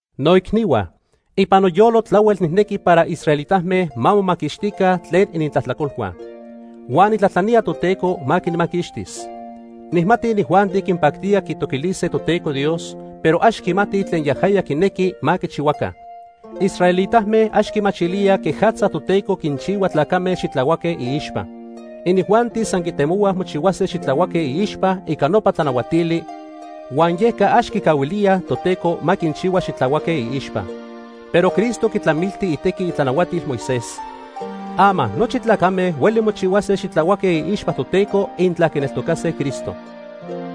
Noicnihua, ipan noyolo tlahuel nijnequi para israelitame ma momaquixtica tlen inintlajtlacolhua. Huan nijtlajtlanía Toteco ma quinmaquixtis. Nijmati inijuanti quinpactía quitoquilise Toteco Dios, pero ax quimatij tlen yajaya quinequi ma quichihuaca. Israelitame ax quimachilíaj quejatza Toteco quinchihua tlacame xitlahuaque iixpa. Inijuanti san quitemohuaj mochihuase xitlahuaque iixpa ica nopa tlanahuatili, huan yeca ax quicahuilíaj Toteco ma quinchihua xitlahuaque iixpa. Pero Cristo quitlamilti itequi itlanahuatil Moisés. Ama nochi tlacame hueli mochihuase xitlahuaque iixpa Toteco intla quineltocase Cristo.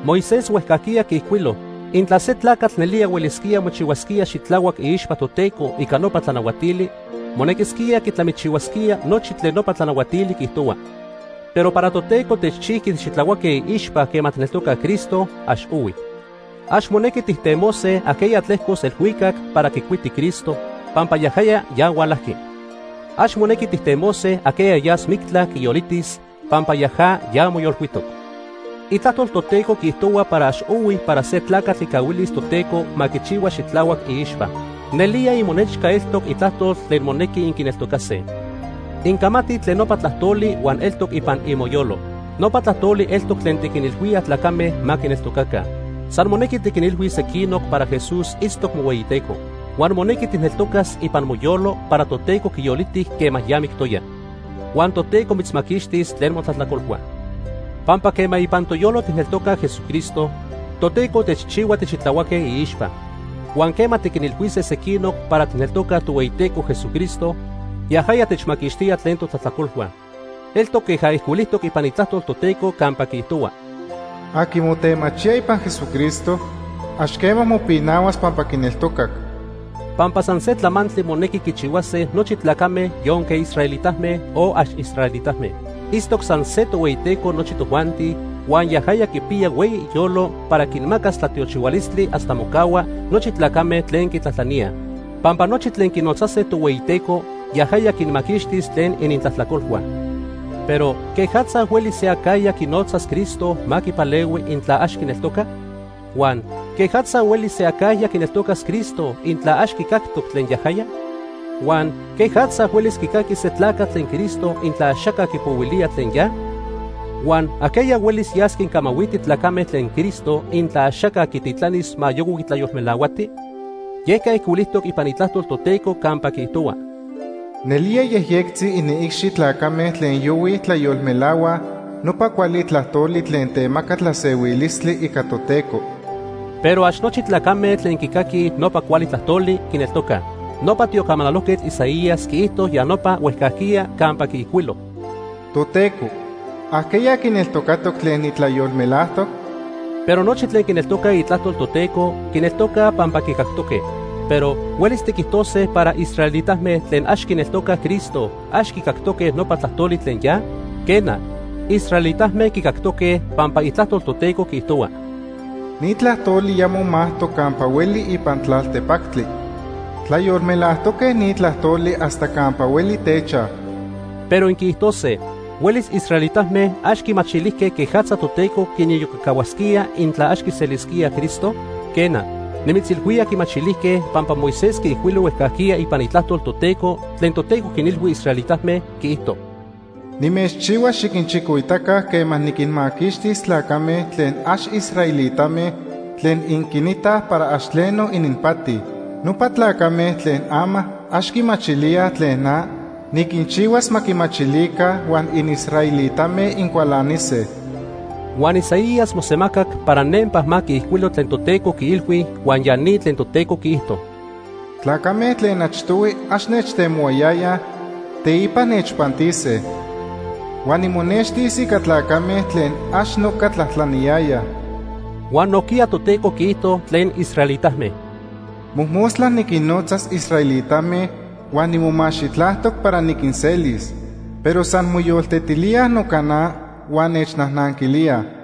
Moisés huejcajquiya quiijcuilo intla se tlacatl nelía huelisquía mochihuasquía xitlahuac iixpa Toteco ica nopa tlanahuatili, monequisquía quitlamichihuasquía nochi tlen nopa tlanahuatili quiijtohuaj. Pero para Toteco techchijqui tixitlahuaque iixpa quema tijneltocaj Cristo, ax ohui. Ax monequi tijtemose ajqueya tlejcos elhuicac para quicuiti Cristo, pampa yajaya ya hualajqui. Ax monequi tijtemose ajqueya yas mictla quiyolitis, pampa yaja ya moyolcuitoc. Itlajtol Toteco quiijtohua para ax ohui para se tlacatl quicahuilis Toteco ma quichihua xitlahuac iixpa. Nelía imonechca eltoc itlajtol tlen monequi inquineltocase. Incamatij tlen nopa tlajtoli huan eltoc ipan imoyolo. Nopa tlajtoli eltoc tlen tiquinilhuíaj tlacame ma quineltocaca. San monequi tiquinilhuis sequinoc para Jesús itztoc mohueyiTeco. Huan monequi tijneltocas ipan moyolo para Toteco quiyoliti quema ya mictoya. Huan Toteco mitzmaquixtis tlen motlajtlacolhua. Pampa quema ipan toyolo tijneltocaj Jesucristo, Toteco techchihua tixitlahuaque iixpa. Huan quema tiquinilhuise sequinoc para tijneltocaj Tohueyiteco Jesucristo, yajaya techmaquixtía tlen totlajtlacolhua. Eltoc queja ijcuilijtoc ipan Itlajtol Toteco campa quiijtohua: “Aqui motemachía ipan Jesucristo, ax quema mopinahuas pampa quineltocac.” Pampa san se tlamantli monequi quichihuase nochi tlacame yonque israelitame, o ax israelitame. Itztoc san se Tohueyiteco nochi tojuanti, huan yajaya quipiya hueyi iyolo para quinmacas tlatiochihualistli hasta mocahua nochi tlacame tlen quitlajtlaníaj. Pampa nochi tlen quinotzase Tohueyiteco, yajaya quinmaquixtis tlen inintlajtlacolhua. Pero ¿quejatza huelis se acajya quinotzas Cristo ma quipalehui intla ax quineltoca? Huan ¿quejatza huelis se acajya quineltocas Cristo intla ax quicactoc tlen yajaya? Huan ¿quejatza huelis quicaquis se tlacatl tlen Cristo intla axaca quipohuilía tlen ya? Huan ¿ajqueya huelis yas quincamahuiti tlacame tlen Cristo intla axaca quititlanis ma yohui tlayolmelahuati? Yeca ijcuilijtoc ipan Itlajtol Toteco campa quiijtohua: “Nelía yejyectzi iniicxi tlacame tlen yohuij tlayolmelahuaj nopa cuali tlajtoli tlen temaca tlasehuilistli ica Toteco.” Pero ax nochi tlacame tlen quicaquij nopa cuali tlajtoli, quineltocaj. Nopa tiocamanalojquetl Isaías quiijto ya nopa huejcajquiya campa quiijcuilo: “Toteco, ¿ajqueya quineltocatoc tlen nitlayolmelajtoc?” Pero nochi tlen quineltocaj itlajtol Toteco, quineltocaj pampa quicactoque. Pero ¿huelis tiquijtose para israelitame tlen ax quineltocaj Cristo ax quicactoque nopa tlajtoli tlen ya? Quena, israelitame quicactoque, pampa Itlajtol Toteco quiijtohua: “Ni tlajtoli ya momajtoc campa hueli ipan tlaltepactli. Tlayolmelajtoque ni tlajtoli hasta campa hueli techaj.” Pero inquiijtose: “¿Huelis israelitame ax quimachilijque quejatza Toteco quiniyocacahuasquía intla ax quiselisquíaj Cristo?” Quena, nimitzilhuía quimachilijque, pampa Moisés quiijcuilo huejcajquiya ipan Itlajtol Toteco tlen Toteco quinilhui israelitame, quiijto: “Nimechchihuas xiquinchicoitaca quema niquinmaquixtis tlacame tlen ax israelitame tlen inquinitaj para ax tleno ininpati. Nopa tlacame tlen ama ax quimachilíaj tlen na, niquinchihuas ma quimachilica huan inisraelitame incualanise.” Huan Isaías mosemacac para nempa ma quiijcuilo tlen Toteco quiilhui huan ya ni tlen Toteco quiijto: “Tlacame tlen achtohui ax nechtemohuayayaj, teipa nechpantise. Huan nimonextis ica tlacame tlen ax noca tlajtlaniyayaj.” Huan nojquiya Toteco quiijto tlen israelitame: “Mojmostla niquinnotza israelitame huan nimomaxitlajtoc para niquinselis, pero san moyoltetilíaj noca na huan nechnajnanquilíaj.”